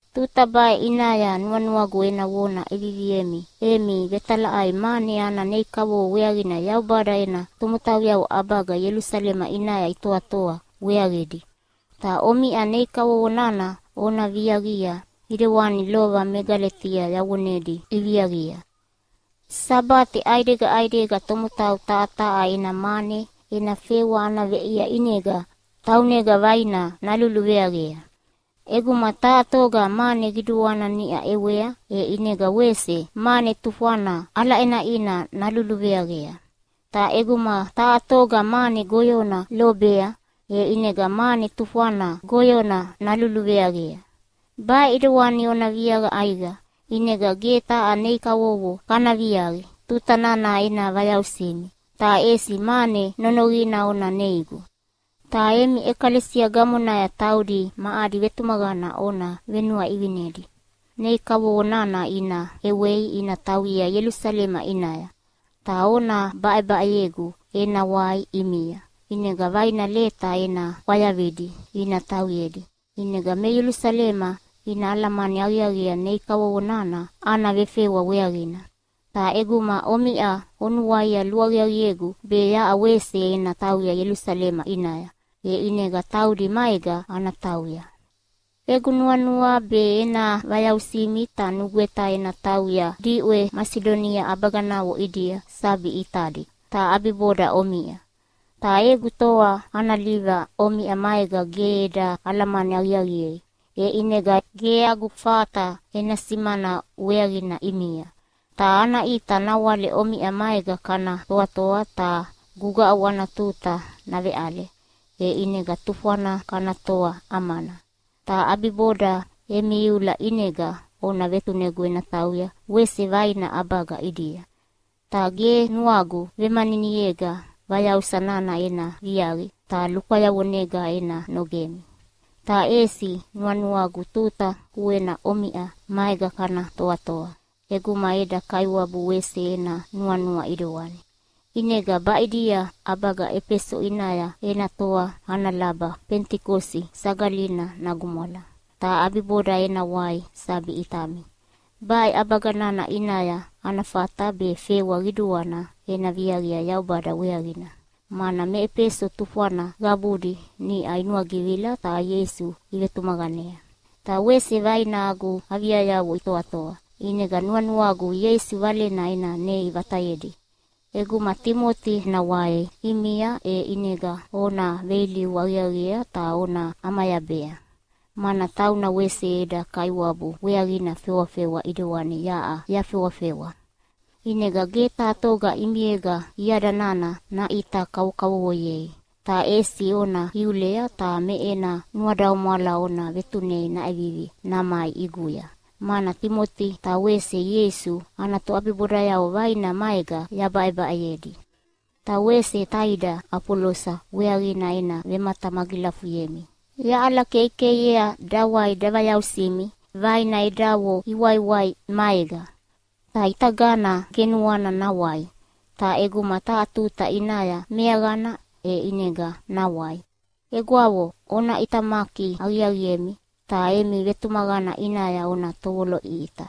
Tuta baʼe ʼinaya nuanuagu ena vona ʼeviviemi emi vetalaʼai mane ana nei kavovo weaqina Yaubada ena tomotauyavo ʼabaga Ielusalema ʼinaya itoatoa weaqidi. Ta omiʼa nei kavovo nana ona viaqia ʼidewani lova me Galetia yavonedi iviaqia. Sabate ʼaidega ʼaidega tomotau taha taha ena mane ena fewa ana veʼia ʼinega taunega vaina naluluveaqea. ʼEguma taha toga mane qiduana niʼa ʼewea, e ʼinega wese mane tufwana ʼalaʼenaʼina naluluveaqea. Ta ʼeguma taha toga mane goyona lobea, e ʼinega mane tufwana goyona naluluveaqea. Baʼe ʼidewani ona viaqa ʼaiqa, ʼinega ge taha nei kavovo kana viaqi tuta nana ena vayausimi, ta ʼesi mane nonoqina ona neigu. Ta emi ʼekalesia gamonaya taudi ma adi vetumaqana ona venuaʼivinedi nei kavovo nana ina ʼewei ina tauyea Ielusalema ʼinaya. Ta ona baʼebaʼeyegu ena wai ʼimia, ʼinega vaina leta ena ʼwayavidi ina tauyedi. ʼInega me Ielusalema ina alamani aqiaqiea nei kavovo nana ana vefewa weaqina. Ta ʼeguma omiʼa onuaia luaqiaqiegu be yaʼa wese ena tauya Ielusalema ʼinaya, e ʼinega taudi maega ana tauya. Egu nuanua be ena vayausimi, ta nugweta ena tauya diʼwe Masidonia ʼabaganavo ʼidia sabi ʼitadi, ta ʼabiboda omiʼa. Ta egu toa ana liva omiʼa maega ge eda alamani aqiaqiei, e ʼinega ge agu fata ena simana weaqina ʼimia. Ta ana ʼita nawale omiʼa maega kana toatoa ta gugaʼu ana tuta naveʼale, e ʼinega tufwana kana toa ʼamana. Ta ʼabiboda emi iula ʼinega ona vetunegu ena tauya wese vaina ʼabaga ʼidia. Ta ge nuagu vemaniniega vayausa nana ena viaqi ta lukwayavonega ena nogemi. Ta ʼesi nuanuagu tuta kuena omiʼa maega kana toatoa ʼeguma eda Kaiwabu wese ena nuanua ʼidewani. ʼInega baʼidia ʼabaga Efeso ʼinaya ena toa ana laba Fenitikosi Sagalina nagumwala, ta ʼabiboda ena wai sabi ʼitami. Baʼe ʼabaga nana ʼinaya ana fata be fewa qiduana ena viaqia Yaubada weaqina, mana me Efeso tufwana qabudi niʼa inuagivila ta Ieisu ivetumaqanea. Ta wese vaina agu aviayavo itoatoa, ʼinega nuanuagu Ieisu Valena ena nei vatayedi. ʼEguma Timoti nawai ʼimia e ʼinega ona veilivu aqiaqiea ta ona ʼamayabea, mana tauna wese eda Kaiwabu weaqina fewafewa ʼidewani yaʼa yafewafewa. ʼInega ge taha toga ʼimiega iada nana naʼita kavokavovoyei! Ta ʼesi ona iulea ta me ena nuadaumwala ona vetunei naʼevivi namai ʼiguya, mana Timoti ta wese Ieisu ana toʼabibodayavo vaina maega yabaʼebaʼeyedi. Ta wese taida Afolosa weaqina ena vematamagilafuyemi. Yaʼalakeikeiea dawai davayausimi vaina edavo iwaiwai maega. Ta ʼitagana ge nuana nawai, ta ʼeguma taha tuta ʼinaya meaqana, e ʼinega nawai. Egwavo, ona ʼitamaki aqiaqiemi, ta emi vetumaqana ʼinaya ona tovoloʼiʼita.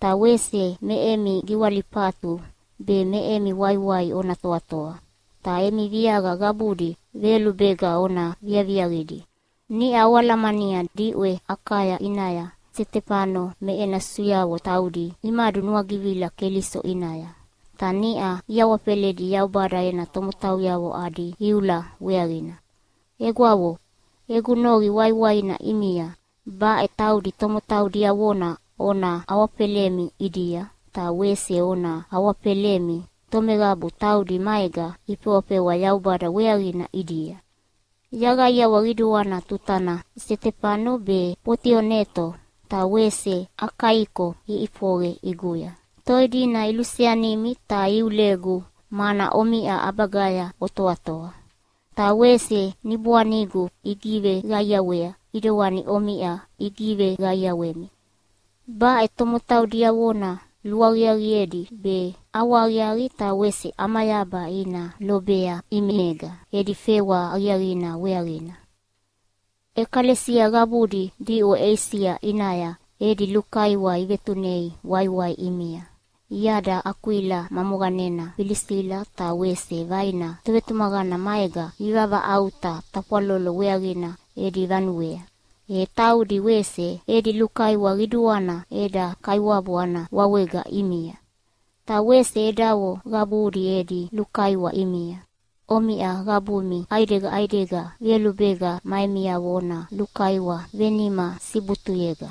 Ta wese me emi giwalifatu be me emi waiwai ona toatoa. Ta emi viaqa qabudi veyolubega ona viaviaqidi. Niʼa oalamania diʼwe Akaya ʼinaya Setefano me ena susuyavo taudi imadunuagivila Keliso ʼinaya. Ta niʼa iawafeledi Yaubada ena tomotauyavo adi iula weaqina. Egwavo, egu noqi waiwaina ʼimia, baʼe taudi tomotau diavona ona awafelemi ʼidia, ta wese ona awafelemi tomeqabu taudi maega ifewafewa Yaubada weaqina ʼidia. Yaqaiawa qiduana tuta nana Setefano be, Fotioneto ta wese Akaiko iʼifoqe ʼiguya. Toi dina iluseanimi ta iulegu mana omiʼa ʼabagaya otoatoa. Ta wese niboanigu igiveqaiawea ʼidewani omiʼa igiveqaiawemi. Baʼe tomotau diavona luaqiaqiedi be ʼawahaqiaqi ta wese ʼamayaba ina lobea ʼimiega edi fewa aqiaqidi weaqina. ʼEkalesia qabudi diʼwe Eisia ʼinaya edi lukaiwa ivetunei waiwai ʼimia. Iada Akwila ma moqanena Filisila ta wese vaina tovetumaqana maega ivavaʼauta tafwalolo weaqina edi vanuea. E taudi wese edi lukaiwa qiduana eda Kaiwabu ana wawega ʼimia. Ta wese edavo qabudi edi lukaiwa ʼimia. Omiʼa qabumi ʼaidega ʼaidega veyolubega ma emiavo ona lukaiwa venima sibutuyega.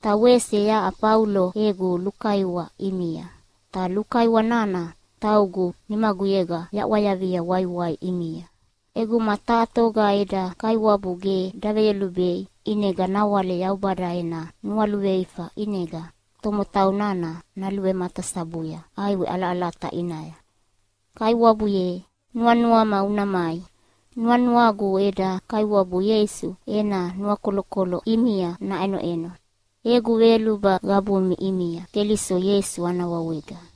Ta wese yaʼa Faulo egu lukaiwa ʼimia, ta lukaiwa nana taugu nimaguyega yaʼwayavia waiwai ʼimia. ʼEguma taha toga eda Kaiwabu ge daveyolubei ʼinega nawale Yaubada ena nualuveifa ʼinega tomotau nana naluvematasabuya ʼaiwe ʼalaʼalata ʼinaya. Kaiwabu ye, nuanuama una mai! Nuanuagu eda Kaiwabu Ieisu ena nuakolokolo ʼimia naʼenoʼeno. Egu veyoluba qabumi ʼimia Keliso Ieisu ana wawega.